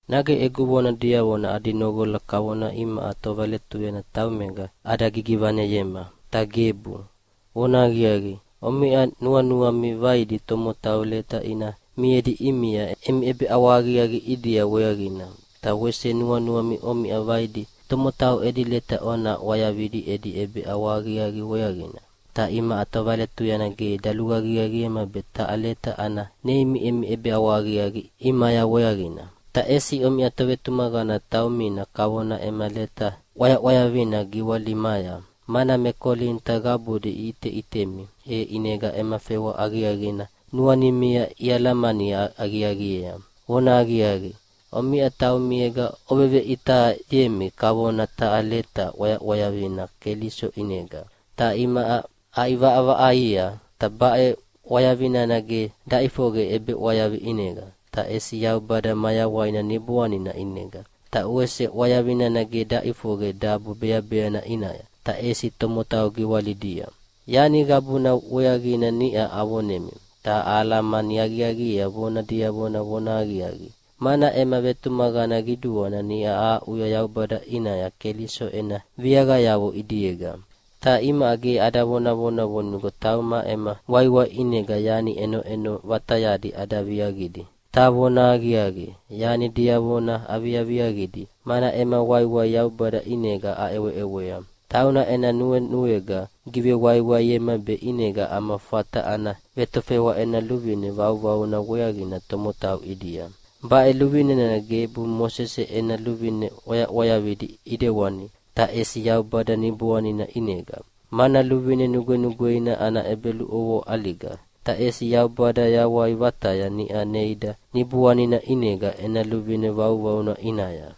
Nage egu vona diavona adi noqola kavona imaʼa tovaletuyana taumega ada gigivaneyema? Ta gebu! Vonahaqiaqi, omiʼa nuanuami vaidi tomotau leta ina miedi ʼimia emi ʼebeʼawahaqiaqi ʼidia weaqina, ta wese nuanuami omiʼa vaidi tomotau edi leta ona ʼwayavidi edi ʼebeʼawahaqiaqi weaqina. Ta imaʼa tovaletuyana ge daluaqiaqiema be taha leta ana neimi emi ʼebeʼawahaqiaqi ʼimaya weaqina. Ta ʼesi omiʼa tovetumaqana taumina kavona ema leta ʼwayaʼwayavina giwalimaya, mana me Kolinita qabudi iʼiteʼitemi, e ʼinega ema fewa aqiaqina nuanimia ialamani aqiaqiea. Vonahaqiaqi, omiʼa taumiega oveveʼitayemi kavona taha leta ʼwayaʼwayavina Keliso ʼinega, ta imaʼa aʼivaʼavaʼaia. Ta baʼe ʼwayavi nana ge daʼifoqe ʼebeʼwayavi ʼinega, ta ʼesi Yaubada mayawaina Niboanina ʼinega. Ta wese ʼwayavi nana ge daʼifoqe dabo beabeana ʼinaya, ta ʼesi tomotau giwalidia. Yani qabuna weaqina niʼa avonemi, ta ahalamani aqiaqiea vona diavona vonahaqiaqi, mana ema vetumaqana qiduana niʼa ahaʼuya Yaubada ʼinaya Keliso ena viaqayavo ʼidiega. Ta imaʼa ge ada vonavona vonigo tauma ema waiwai ʼinega yani ʼenoʼeno vatayadi ada viaqidi. Ta vonahaqiaqi, yani diavona aviaviaqidi, mana ema waiwai Yaubada ʼinega aʼeweʼewea. Tauna ena nuenuega givewaiwaiema be ʼinega ama fata ana vetofewa ena luvine vauvauna weaqina tomotau ʼidia. Baʼe luvine nana gebu Mosese ena luvine ʼwayaʼwayavidi ʼidewani, ta ʼesi Yaubada Niboanina ʼinega. Mana luvine nugwenugweina ana ʼebeluʼovoa ʼaliga, ta ʼesi Yaubada yawai vataya niʼa neida Niboanina ʼinega ena luvine vauvauna ʼinaya.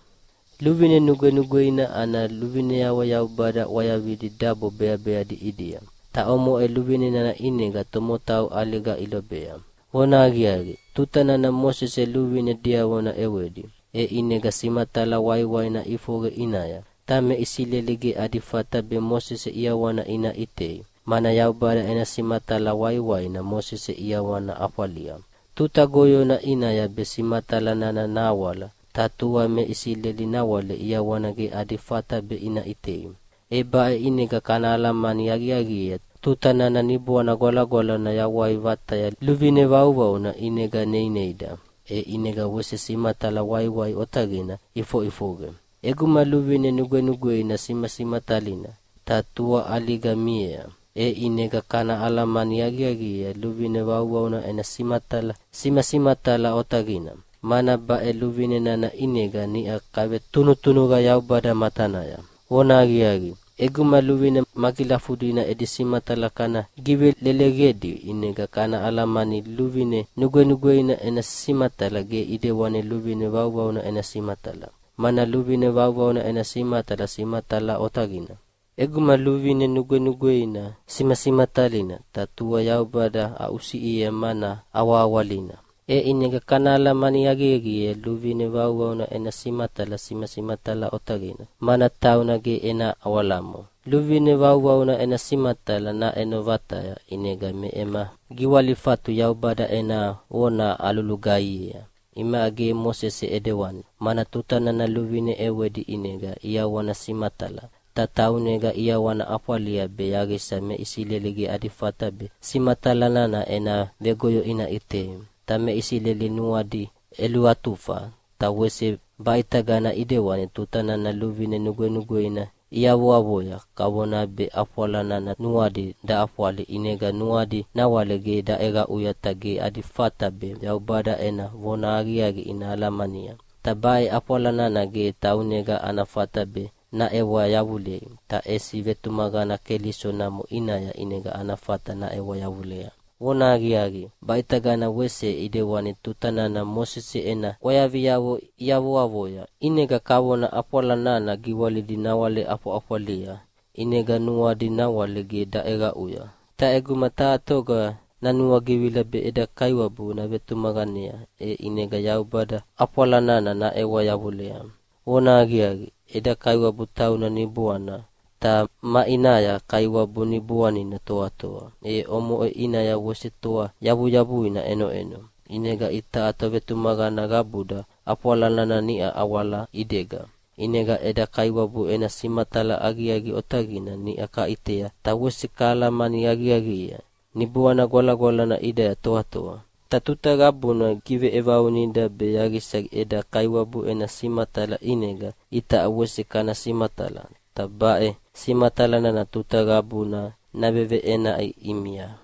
Luvine nugwenugweina ana luvineavo Yaubada ʼwayavidi dabo beabeadi ʼidia. Ta omoʼe luvine nana ʼinega tomotau ʼaliga ilobea. Vonahaqiaqi, tuta nana Mosese luvine diavona ʼewedi, e ʼinega simatala waiwaina ʼifoqe ʼinaya. Ta me Isileli ge adi fata be Mosese ʼiawana ina ʼitei, mana Yaubada ena simatala waiwaina Mosese ʼiawana ʼafwalia. Tuta goyona ʼinaya be simatala nana nahawala, ta tua me Isileli nawale ʼiawana ge adi fata be ina ʼitei. E baʼe ʼinega kana alamani aqiaqiea tuta nana Niboana Gwalagwalana yawai vataya luvine vauvauna ʼinega neineida, e ʼinega wese simatala waiwai otaqina ʼifoʼifoqe. ʼEguma luvine nugwenugweina simasimatalina, ta tua ʼaliga miea. E ʼinega kana alamani aqiaqiea luvine vauvauna ena simatala simasimatala otaqina, mana baʼe luvine nana ʼinega niʼa kavetunutunuqa Yaubada matanaya. Vonahaqiaqi, ʼeguma luvine magilafudina edi simatala kana giveleleqedi ʼinega kana alamania luvine nugwenugweina ena simatala ge ʼidewani luvine vauvauna ena simatala, mana luvine vauvauna ena simatala simasimatala otaqina. ʼEguma luvine nugwenugweina simasimatalina, ta tua Yaubada aʼusiʼiea mana awahawalina, e ʼinega kana alamani aqiaqiea luvine vauvauna ena simatala simasimatala otaqina, mana tauna ge ena awalamo. Luvine vauvauna ena simatala naʼeno vataya, ʼinega me ema giwalifatu Yaubada ena vona alulugaihiea. Imaʼa ge Mosese ʼidewani, mana tuta nana luvine ʼewedi ʼinega ʼiawana simatala, ta taunega ʼiawana ʼafwalia be yaqisa me Isileli ge adi fata be simatala nana ena vegoyo ina ʼitei. Ta me Isileli nuadi ʼeluatufa, ta wese baʼitagana ʼidewani tuta nana luvine nugwenugweina iavoavoya. Kavona be ʼafwala nana nuadi daʼafwali ʼinega nuadi nawale ge daʼeqaʼuya ta ge adi fata be Yaubada ena vonahaqiaqi ina alamania. Ta baʼe ʼafwala nana ge taunega ana fata be naʼewa yavulei, ta ʼesi vetumaqana Keliso namo ʼinaya ʼinega ana fata naʼewa yavulea. Vonahaqiaqi, baʼitagana wese ʼidewani tuta nana Mosese ena ʼwayaviavo iavoavoya, ʼinega kavona ʼafwala nana giwalidi nawale ʼafwaʼafwalia, ʼinega nuadi nawale ge daʼeqaʼuya. Ta ʼeguma taha toga nanuagivila be eda Kaiwabu navetumaqanea, e ʼinega Yaubada ʼafwala nana naʼewa yavulea. Vonahaqiaqi, eda Kaiwabu tauna Niboana, ta maʼinaya Kaiwabu Niboanina toatoa, e omoʼe ʼinaya wese toa yavuyavuina ʼenoʼeno. ʼInega itaʼa tovetumaqana qabuda ʼafwala nana niʼa awala ʼidega, ʼinega eda Kaiwabu ena simatala aqiaqi otaqina niʼa kaʼitea ta wese kahalamani aqiaqiea. Niboana Gwalagwalana ʼidaya toatoa, ta tuta qabuna gigiveʼevaunida be yaqisa eda Kaiwabu ena simatala ʼinega itaʼa wese kana simatala, ta baʼe simatala nana tuta qabuna naveveʼenaʼi ʼimia.